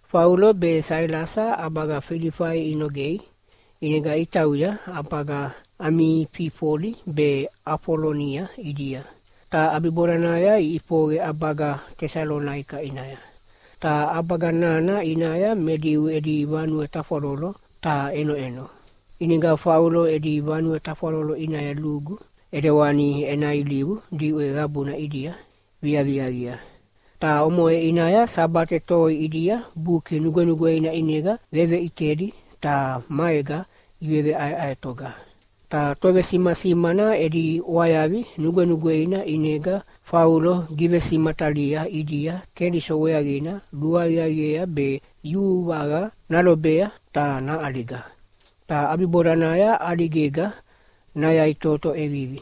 Faulo be Sailasa ʼabaga Filifai inogei. ʼInega itauya ʼabaga Amififoli be Afolonia ʼidia, ta ʼabibodanaya iʼifoqe ʼabaga Tesalonaika ʼinaya. Ta ʼabaga nana ʼinaya me Diu edi vanue tafwalolo taha ʼenoʼeno. ʼInega Faulo edi vanue tafwalolo ʼinaya lugu, ʼedewani ena ilivu diʼwe qabuna ʼidia viaviaqia. Ta omoʼe ʼinaya Sabate toi ʼidia Buki Nugwenugweina ʼinega veveʼitedi ta maega iveʼaeʼaetoga. Ta tovesimasimana edi ʼwayavi nugwenugweina ʼinega Faulo givesimatalia ʼidia Keliso weaqina luaqiaqiea be yuvaqa nalobea ta naʼaliga, ta ʼabibodanaya ʼaligega nayaʼitoto ʼevivi.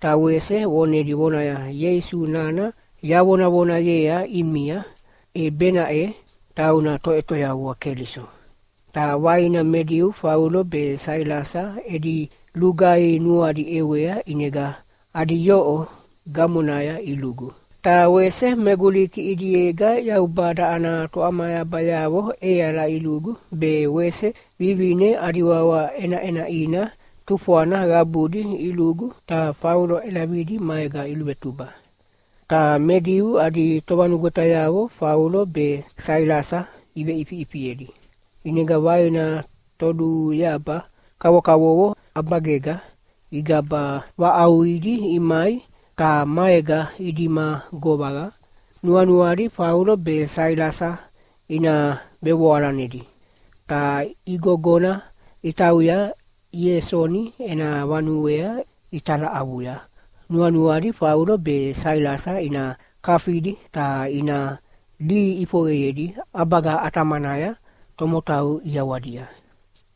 Ta wese vonedi vonaya, “Ieisu nana yavonavonayea ʼimia, e benaʼe tauna Toʼetoyavua Keliso.” Ta vaina me Diu Faulo be Sailasa edi lugaihi nuadi ʼewea ʼinega adi yoʼo gamonaya ilugu. Ta wese me Guliki ʼidiega Yaubada ana toʼamayabayavo ʼeala ilugu be wese vivine adi wawa ʼenaʼenaʼina tufwana qabudi ilugu ta Faulo ʼelavidi maega iluvetuba. Ta me Diu adi tovanugwetayavo Faulo be Sailasa iveʼifiʼifiedi. ʼInega vaina toluyaba kavokavovo ʼabagega igaba vaʼauqidi imai ta maega idima govaqa, nuanuadi Faulo be Sailasa ina vevoalanedi. Ta igogona itauya Iesoni ena vanuea italaʼavuya nuanuadi Faulo be Sailasa ina kafidi ta ina lihi ʼifoqeyedi ʼabaga ʼatamanaya tomotau ʼiawadia.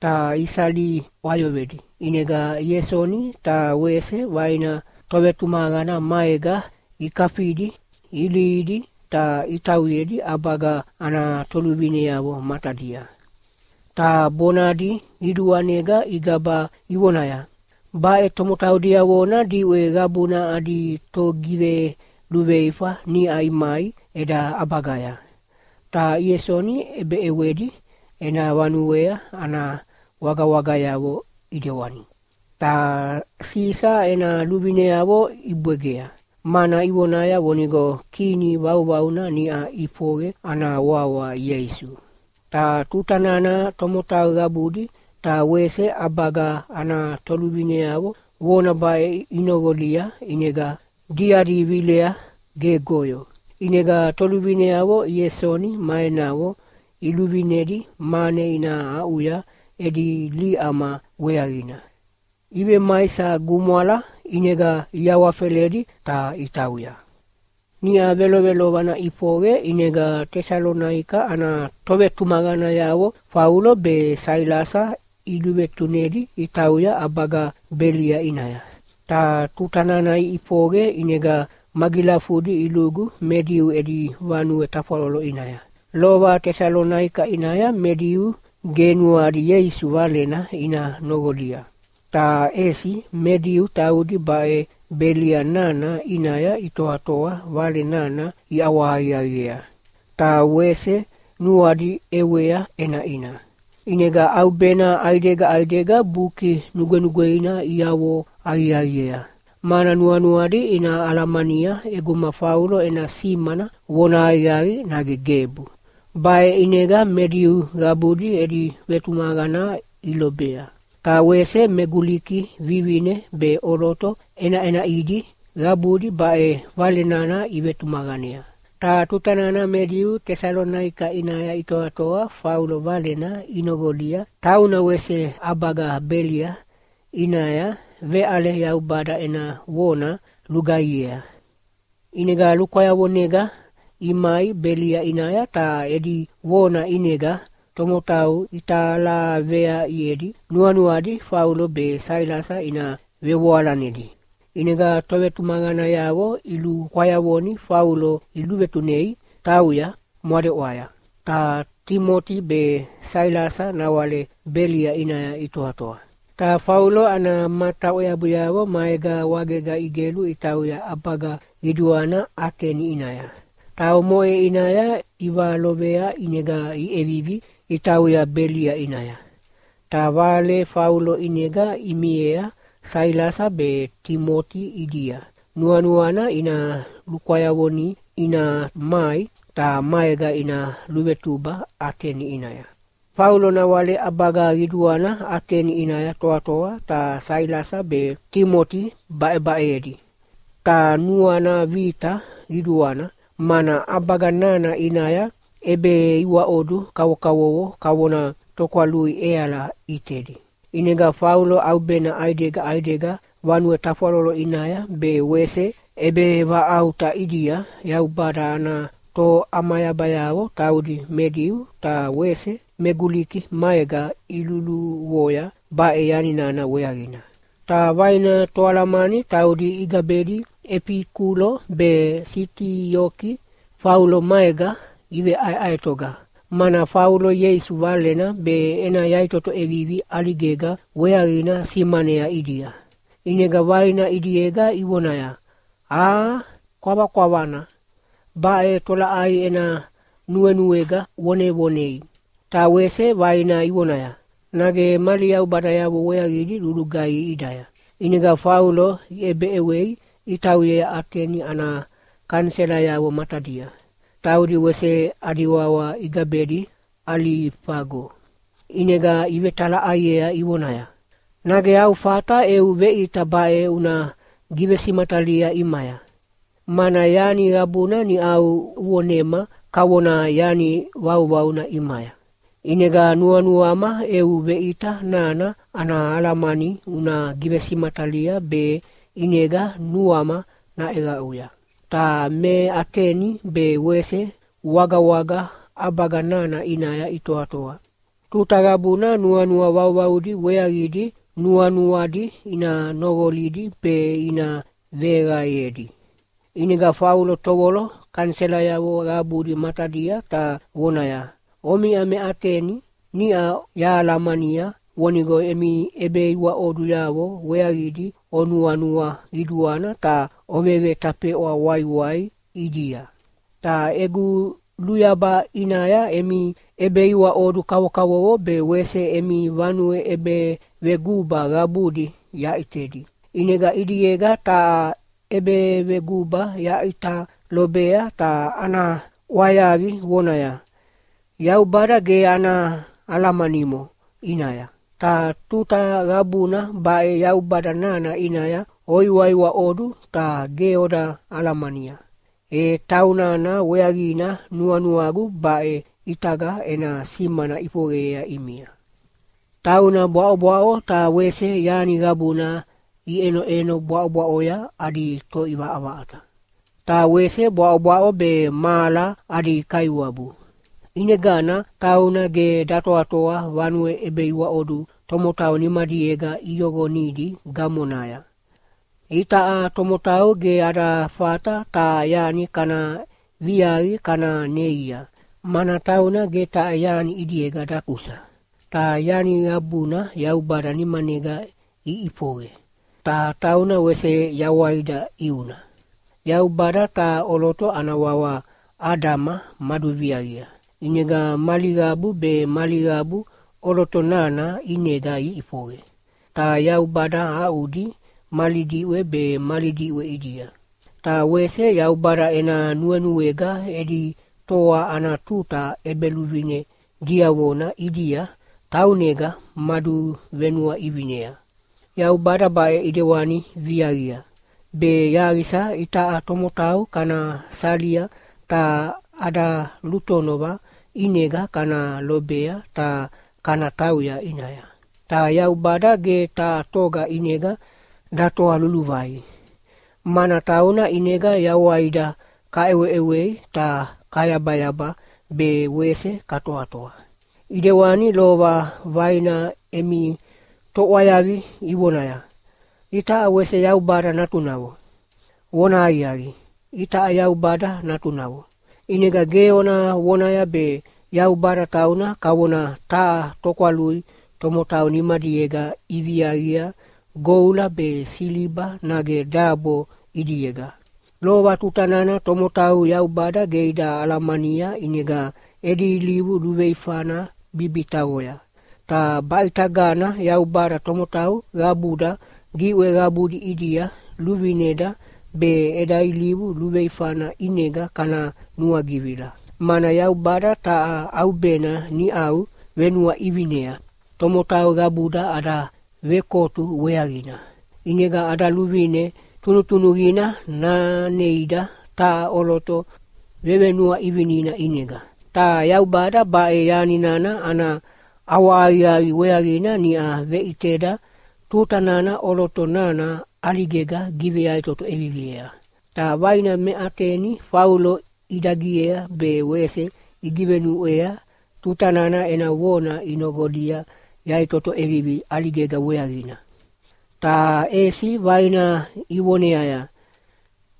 Ta isali ʼwayoqedi, ʼinega Iesoni ta wese vaina tovetumaqana maega ikafidi ilihidi ta itauyedi ʼabaga ana toluvineavo matadia. Ta bonadi qiduanega igaba ivonaya, “Baʼe tomotau diavona diʼwe qabuna adi togiveluveifa niʼa imai eda ʼabagaya, ta Iesoni ʼebeʼewedi ena vanuea ana wagawagayavo ʼidewani. Ta Sisa ena luvineavo ibwegea, mana ivonaya vonigo Kini vauvauna niʼa ʼifoqe ana wawa Ieisu.” Ta tuta nana tomotau qabudi ta wese ʼabaga ana toluvineavo vona baʼe inoqolia ʼinega diadi vilea gegoyo. ʼInega toluvineavo Iesoni ma enavo iluvinedi mane ina aʼuya edi liʼama weaqina. Ivemaisa gumwala, ʼinega iawafeledi ta itauya. Niʼa velovelovana ʼifoqe ʼinega Tesalonaika ana tovetumaqanayavo Faulo be Sailasa iluvetunedi itauya ʼabaga Belia ʼinaya. Ta tuta nana iʼifoqe ʼinega magilafudi ilugu me Diu edi vanue tafwalolo ʼinaya. Lova Tesalonaika ʼinaya me Diu ge nuadi Ieisu Valena ina noqolia. Ta ʼesi me Diu taudi baʼe Belia nana ʼinaya itoatoa Vale nana iʼawahaqiaqiea, ta wese nuadi ʼewea ʼenaʼina. ʼInega ʼaubena ʼaidega ʼaidega Buki Nugwenugweina iavo aqiaqiea, mana nuanuadi ina alamania ʼeguma Faulo ena simana vona aqiaqina nage gebu. Baʼe ʼinega me Diu qabudi edi vetumaqana ilobea. Ta wese me Guliki vivine be ʼoloto ʼenaʼenaʼidi qabudi baʼe Vale nana ivetumaqanea. Ta tuta nana me Diu Tesalonaika ʼinaya itoatoa Faulo valena inoqolia tauna wese ʼabaga Belia ʼinaya veʼale Yaubada ena vona lulugaihiea, ʼinega lukwayavonega imai Belia ʼinaya ta edi vona ʼinega tomotau italaveaʼiedi nuanuadi Faulo be Sailasa ina vevoalanedi. ʼInega tovetumaqanayavo ilukwayavoni Faulo iluvetunei tauya mwadeʼwaya. Ta Timoti be Sailasa nawale Belia ʼinaya itoatoa. Ta Faulo ana mata ʼweabuyavo maega wagega igelu itauya ʼabaga qiduana Ateni ʼinaya. Ta omoʼe ʼinaya ivalovea ʼinega iʼevivi itauya Belia ʼinaya. Ta vale Faulo ʼinega imiea Sailasa be Timoti ʼidia nuanuana ina lukwayavoni ina mai, ta maega ina luvetuba Ateni ʼinaya. Faulo nawale ʼabaga qiduana Ateni ʼinaya toatoa ta Sailasa be Timoti baʼebaʼeyedi. Ta nuana vita qiduana, mana ʼabaga nana ʼinaya ʼebeiwaʼodu kavokavovo kavona tokwalui ʼeala ʼitedi. ʼInega Faulo ʼaubena ʼaidega ʼaidega vanue tafwalolo ʼinaya be wese ʼebevaʼauta ʼidia Yaubada ana toʼamayabayavo taudi me Diu ta wese me Guliki maega iluluvoya baʼe yani nana weaqina. Ta vaina toalamani taudi igabedi Efikulo be Sitioki, Faulo maega iveʼaeʼaetoga, mana Faulo Ieisu Valena be ena yaʼitoto ʼevivi ʼaligega weaqina simanea ʼidia. ʼInega vaina ʼidiega ivonaya, “Aa, kwavakwavana, baʼe tolaʼai ena nuenuega vonevonei?” Ta wese vaina ivonaya, “Nage mali yaubadayavo weaqidi luluqaihi ʼidaya?” ʼInega Faulo iʼebeʼewei itauyea Ateni ana kaniselayavo matadia, taudi wese adi wawa igabedi Alifago. ʼInega ivetalaʼaiea ivonaya, “Nage au fata eu veʼita baʼe una givesimatalia ʼimaya? Mana yani qabuna niʼau uvonema kavona yani vauvauna ʼimaya. ʼInega nuanuama eu veʼita nana ana alamani una givesimatalia be ʼinega nuama naʼeqaʼuya.” (Ta me Ateni be wese wagawaga ʼabaga nana ʼinaya itoatoa, tuta qabuna nuanua vauvaudi weaqidi nuanuadi ina noqolidi be ina veqaeyedi.) ʼInega Faulo tovolo kaniselayavo qabudi matadia ta vonaya, “Omiʼa me Ateni, niʼa yahalamania vonigo emi ʼebeiwaʼoduyavo weaqidi onuanua qiduana ta ovevetafeʼwa waiwai ʼidia. Ta egu luyaba ʼinaya emi ʼebeiwaʼodu kavokavovo be wese emi vanue ʼebeveguba qabudi yaʼitedi. ʼInega ʼidiega taha ʼebeveguba yaʼita lobea ta ana ʼwayavi vonaya, ‘Yaubada ge ana alamanimo ʼinaya.’ Ta tuta qabuna baʼe Yaubada nana ʼinaya oiwaiwaʼodu ta ge oda alamania. E taunana weaqina nuanuagu baʼe ʼitaga ena simana ʼifoqeyea ʼimia. “Tauna bwaʼobwaʼo ta wese yani qabuna iʼenoʼeno bwaʼobwaʼoya adi Toʼivaʼavaʼata. Ta wese bwaʼobwaʼo be mahala adi Kaiwabu. ʼInegana tauna ge datoatoa vanue ʼebeiwaʼodu tomotau nimadiega iyoqonidi gamonaya. Itaʼa tomotau ge ada fata taha yani kana viaqi kana neia, mana tauna ge taha yani ʼidiega dakusa. Ta yani qabuna Yaubada nimanega iʼifoqe, ta tauna wese yawaida ʼiuna. Yaubada taha ʼoloto ana wawa Adama maduviaqia, ʼinega mali qabu be mali qabu ʼoloto nana ʼinega iʼifoqe, ta Yaubada aʼudi mali diʼwe be mali diʼwe ʼidia. Ta wese Yaubada ena nuenuega edi toa ana tuta ʼebeluvine diavona ʼidia taunega maduvenuaʼivinea. Yaubada baʼe ʼidewani viaqia, be yaqisa itaʼa tomotau kana salia ta ada lutonova ʼinega kana lobea ta kana tauya ʼinaya. Ta Yaubada ge taha toga ʼinega datoa luluvai. ‘Mana tauna ʼinega yawaida kaʼeweʼewei ta kayabayaba be wese katoatoa.’ ʼIdewani lova vaina emi toʼwayavi ivonaya, ‘Itaʼa wese Yaubada natunavo.’ “Vonahaqiaqi, itaʼa Yaubada natunavo. ʼInega ge ona vonaya be Yaubada tauna kavona taha tokwalui tomotau nimadiega iviaqia goula be siliba nage dabo ʼidiega. Lova tuta nana tomotau Yaubada ge ida alamania ʼinega edi ilivu luveifana bibitaqoya, ta baʼitagana Yaubada tomotau qabuda diʼwe qabudi ʼidia luvineda be eda ilivu luveifana ʼinega kana nuagivila. Mana Yaubada taha ʼaubena niʼau venuaʼivinea tomotau qabuda ada vekotu weaqina. ʼInega ada luvine tunutunuqina naneida taha ʼoloto vevenuaʼivinina ʼinega. Ta Yaubada baʼe yani nana ana ʼawahaqiaqi weaqina niʼa veʼiteda tuta nana ʼoloto nana ʼaligega giveyaʼitoto ʼeviviea.” Ta vaina me Ateni Faulo idagiea be wese igivenuʼwea tuta nana ena vona inoqolia yaʼitoto ʼevivi ʼaligega weaqina. Ta ʼesi vaina ivoneaya,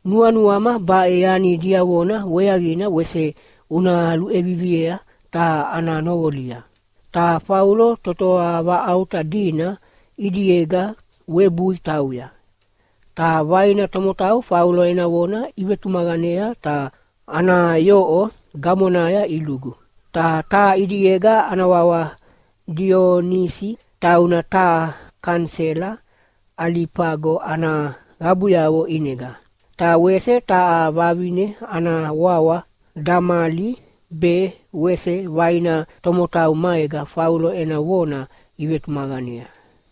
“Nuanuama baʼe yani diavona weaqina wese una luʼeviviei ta ana noqolia.” Ta Faulo totoa vaʼauta dina ʼidiega webui tauya. Ta vaina tomotau Faulo ena vona ivetumaqanea ta ana yoʼo gamonaya ilugu. Ta taha ʼidiega ana wawa Dionisi, tauna taha kanisela Alifago ana qabuyavo ʼinega. Ta wese taha vavine ana wawa Damali be wese vaina tomotau maega Faulo ena vona ivetumaqanea.